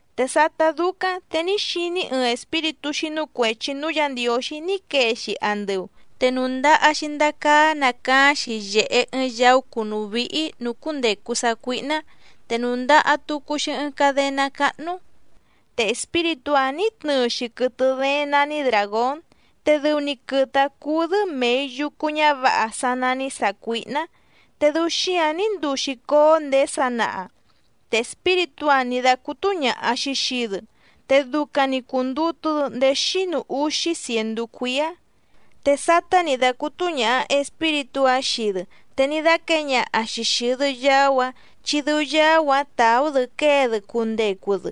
Te sátá dúcáⁿ te ní xiní‑í ɨɨⁿ espíritú xínú cuèchi núú Yǎ Ndiǒxí ní quee‑xi andɨu, te nùndaha‑xi ndacaá nacaáⁿ‑xi yèhe ɨɨⁿ yaú cùnú víhí nǔú cúndècu sácuíhná, te nùndaha tucu‑xi ɨɨⁿ cadená cáhnú. Te espíritú‑áⁿ nǐ tnɨɨ‑xi quɨtɨ dééⁿ nání dràgón, te dɨu‑ni quɨtɨ‑áⁿ cúú‑dɨ́ mèi yucu ñávǎha sá nání sàcuíhná, te dɨu xíǎⁿ ní nduu‑xi cóó ndèé sanaha. Te espíritú‑áⁿ nǐ dácútú ñàha‑xi xii‑dɨ, te ducaⁿ‑ni cùndutu‑dɨ ndéé xínu úxí cièndú cuíá. Te sátá nǐ dácútú ñàha espíritú‑áⁿ xii‑dɨ te ní dáquěe ñaha‑xi xìi‑dɨ yaú‑áⁿ chi dɨu yaú‑áⁿ tàú‑dɨ quée‑dɨ cundecu‑dɨ.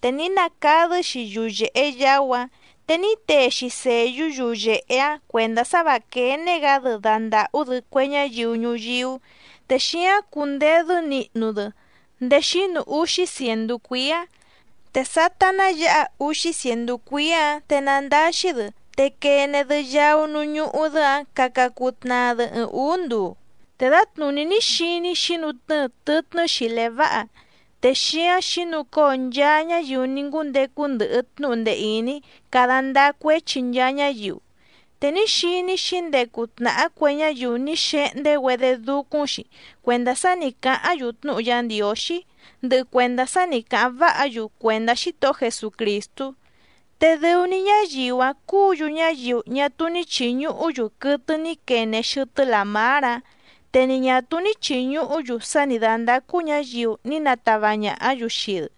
Te ní nacadɨ́‑xi yuyèhe yaú‑áⁿ, te ní tee‑xi sèyú yuyèhe‑áⁿ cuèndá sá và quéné‑gǎ‑dɨ dandàhú‑dɨ cue ñáyiu ñuyíú, te xíáⁿ cundedɨ́ nihnu‑dɨ ndéé xínu úxí cièndú cuíá. Te sátá ná yǎha úxí cièndú cuíá‑ǎⁿ te nandáxí‑dɨ te quene‑dɨ yaú núú ñúhú‑dɨ́‑ǎⁿ caca cuu tnaa‑dɨ ɨɨⁿ ǔú nduu. Te dǎtnùní ní xiní‑í xǐnutnɨ́ɨ tɨtnɨ́ xìlé váha, te xíáⁿ xǐnucóo nchaa ñáyiu ní ngúndecu ndɨhɨ tnúhu ndee ìní cada ndáá cuéchi nchaa ñáyiu, te ní xiní‑í xǐndecu tnàhá cue ñáyiu ní xehndé‑güedé dúcúⁿ‑xi cuèndá sá nǐ cáháⁿ‑yu tnúhu Yá Ndiǒxí, ndɨhɨ cuèndá sá nǐ cáháⁿ váha‑yu cuèndá Xítohó Jesucrìstú. Te dɨu‑ni ñáyiu‑áⁿ cúǔ‑yu ñáyiu ñá túú ní chìñuhú‑yu quɨtɨ ní quene xɨtɨ́ làmár‑áⁿ, te ni ñà túú ní chìñuhú‑yu sá nǐ dándácú ñǎyiu ní natava ñàhá‑yu xii‑dɨ,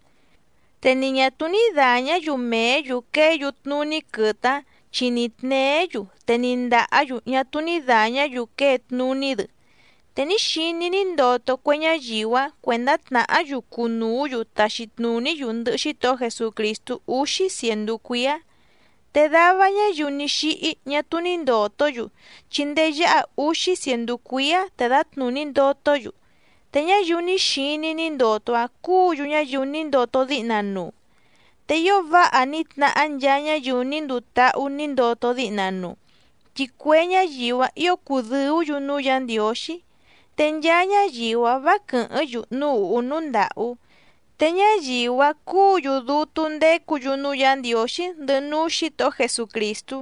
te ni ñà túú ní dàñá‑yu mèé‑yu quée‑yu tnuní quɨtɨ‑áⁿ chi ni tněé‑yu te ni ndàhá‑yu ñá túú ní dàñá‑yu quée tnuní‑dɨ. Te ní xiní‑í ní ndoto cue ñáyiu‑áⁿ cuèndá tnàhá‑yu cunùú‑yu taxi tnùní‑yu ndɨhɨ Xítohó Jesucrìstú úxí cièndú cuíá. Te dava ñáyiu ní xíhí ñá túú ní ndòtó‑yu, chi ndéé yáha úxí cièndú cuíá te dǎtnùní ndotó‑yu. Te ñáyiu ní xiní‑í ní ndoto‑áⁿ cúǔ‑yu ñáyiu ní ndoto díhna nuu. ¡Te ío váha ní tnahá nchaa ñáyiu ní nduu táhú nǐ ndoto díhna nuu!, chi cue ñáyiu‑áⁿ ǐo cùdɨú‑yu núú Yǎ Ndiǒxí, te nchaa ñáyiu‑áⁿ vǎ quɨ̀hɨ́ⁿ‑yu núú ùhú núú ndàhú, te ñáyiu‑áⁿ cúǔ‑yu dútú ndécǔ‑yu núú Yǎ Ndiǒxí ndɨhɨ núú Xǐtohó Jesucrìstú,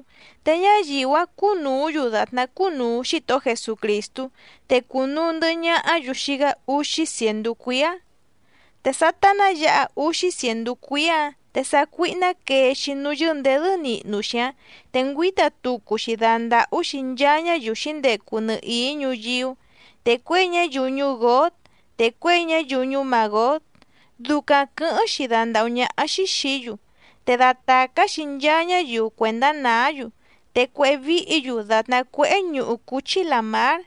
te ñáyiu‑áⁿ cúnùú‑yu dàtná cúnùu Xítohó Jesucrìstú, te cunuu ndɨ̀hɨ ñahá‑yu xii‑gá úxí cièndú cuíá. Te sátá ná yǎha úxí cièndú cuíá‑ǎⁿ te sácuíhná quee‑xi núú yɨ́ndèdɨ́ nihnu‑xi‑áⁿ, te ngüíta tucu‑xi dandàhú‑xi nchaa ñáyiu xǐndecu nɨhìí ñuyíú, te cuěi ñáyiu ñuú Gǒg, te cuěi ñáyiu ñuú Màgóg ducaⁿ quɨ̌hɨ́ⁿ‑xi dandàhú ñáhá‑xí xìí‑yu, te datàcá‑xi nchaa ñáyiu cuèndá nàá‑yu, te cuéhé víhǐ‑yu dàtná cuéhé ñuhu cúchí làmár.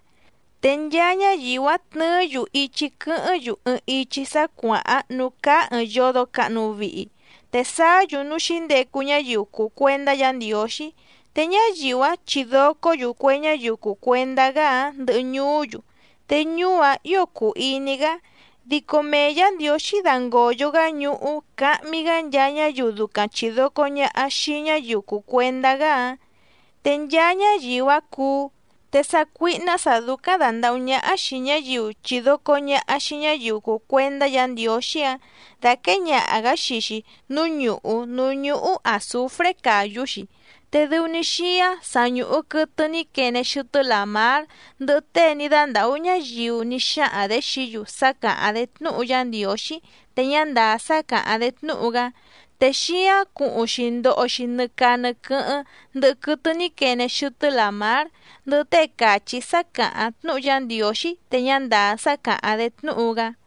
Te nchaa ñáyiu‑áⁿ tnɨɨ́‑yu ichi quɨ́hɨ́ⁿ‑yu ɨɨⁿ ichi sá cuàháⁿ núú cáá ɨ̀ɨⁿ yodo cahnu vihi, te sáá‑yu núú xǐndecu ñáyiu cùu cuendá Yǎ Ndiǒxí, te ñáyiu‑áⁿ chidòcó‑yu cue ñáyiu cùu cuendá‑gá‑áⁿ ndɨhɨ ñuú‑yu, te ñuú‑áⁿ ǐo cùu iní‑gá, dico mee Yǎ Ndiǒxí dangòyo‑gá ñuhú cahmi‑gá nchaa ñáyiu ducaⁿ chìdoco ñaha xii ñáyiu cùu cuendá‑gá‑áⁿ, te nchaa ñáyiu‑áⁿ cuú. Te sácuíhná sǎ dúcáⁿ dàndahú ñáhá xìi ñáyiu chidoco ñàha xii ñáyiu cùu cuendá Yǎ Ndiǒxí‑áⁿ dàquée ñaha‑gǎ xii‑xi núú ñùhú núú ñúhú àzufré càyú‑xi, te dɨu‑ni xíáⁿ sa ñùhu quɨtɨ ní quene xɨtɨ́ làmár, ndɨhɨ tée ní dándàhú ñáyiu ní xáhaⁿ‑dě xií‑yu sá càháⁿ‑dé tnúhu Yá Ndiǒxí te ñá ndàá sá càháⁿ‑dé tnúhu‑gá, te xíáⁿ cuhuⁿ‑xi ndoho‑xi nɨ caa nɨ quɨ́hɨ́ⁿ ndɨhɨ quɨtɨ ní quene xɨtɨ́ làmár, ndɨhɨ tée càchí sá càháⁿ tnúhu Yá Ndiǒxí te ñá ndàá sá càháⁿ‑dé tnúhu‑gá.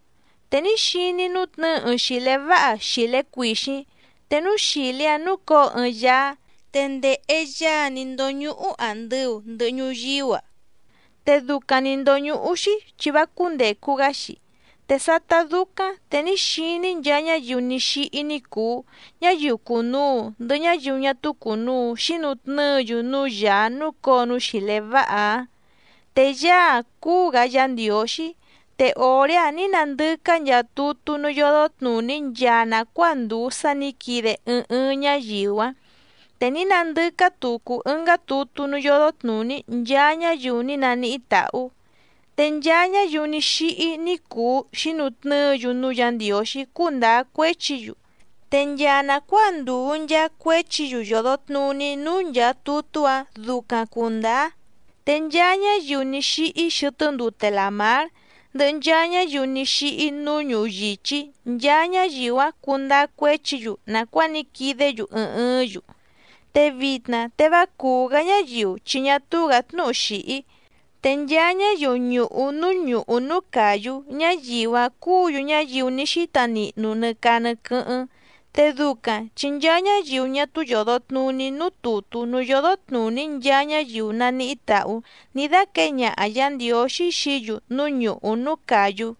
Te ní xiní‑í nútnɨ̌ɨ ɨɨⁿ xìlé váha xìlé cuìxíⁿ, te núú xìlé‑áⁿ núcǒo ɨɨⁿ Yaá. Te ndèhe Yaá‑áⁿ nì ndóñúhú àndɨu ndɨhɨ ñuyíú‑a, te ducaⁿ nǐ ndóñúhú‑xí chi vá cúndècu‑gá‑xi. Te sátá dúcáⁿ te ní xiní‑í nchaa ñáyiu ní xíhí ní cùu, ñáyiu cùnuu ndɨhɨ ñáyiu ñá túú cùnuu xínutnɨ́ɨ‑yu núú Yàá núcǒo núú xìlé váha‑áⁿ, te Yaá‑áⁿ cúú‑gǎ Yǎ Ndiǒxí, te òré‑áⁿ nǐ nandɨcá nchaa tutú núú yódó tnùní nchaa nàcuáa ndùu sá nǐ quide ɨɨⁿ ɨɨⁿ ñáyiu‑áⁿ, te ní nandɨcá tucu ɨngá tutú núú yódó tnùní nchaa ñáyiu ní naníhí tàhú, te nchaa ñáyiu ní xíhí ní cùu xínutnɨ́ɨ‑yu núú Yǎ Ndiǒxí cundáá cuéchi‑yu, te nchaa nàcuáa ndùu nchaa cuéchi‑yu yòdo tnuní núú nchàa tutú‑áⁿ ducaⁿ cùndáá. Te nchaa ñáyiu ní xíhí xɨtɨ́ ndute làmár, ndɨhɨ nchaa ñáyiu ní xíhí núú ñuhu yìchí nchaa ñáyiu‑áⁿ cundáá cuéchi‑yu nàcuáa ní quidé‑yu ɨɨⁿ ɨɨ́ⁿ‑yu. Te vitna te vá cùú‑gá ñáyiu chi ñá túú‑gǎ tnúhu xìhí, te nchaa ñáyiu ñùhu núú ñùhú núú càyú ñáyiu‑áⁿ cúǔ‑yu ñáyiu ní xíta nihnu nɨ caa nɨ quɨ́hɨ́ⁿ. Te ducaⁿ chi nchaa ñáyiu ñá túú yòdo tnuní núú tùtú núú yódó tnùní nchaa ñáyiu naníhí tàhú ní dáquěe ñaha Yǎ Ndiǒxí xií‑yu núú ñùhú núú càyú.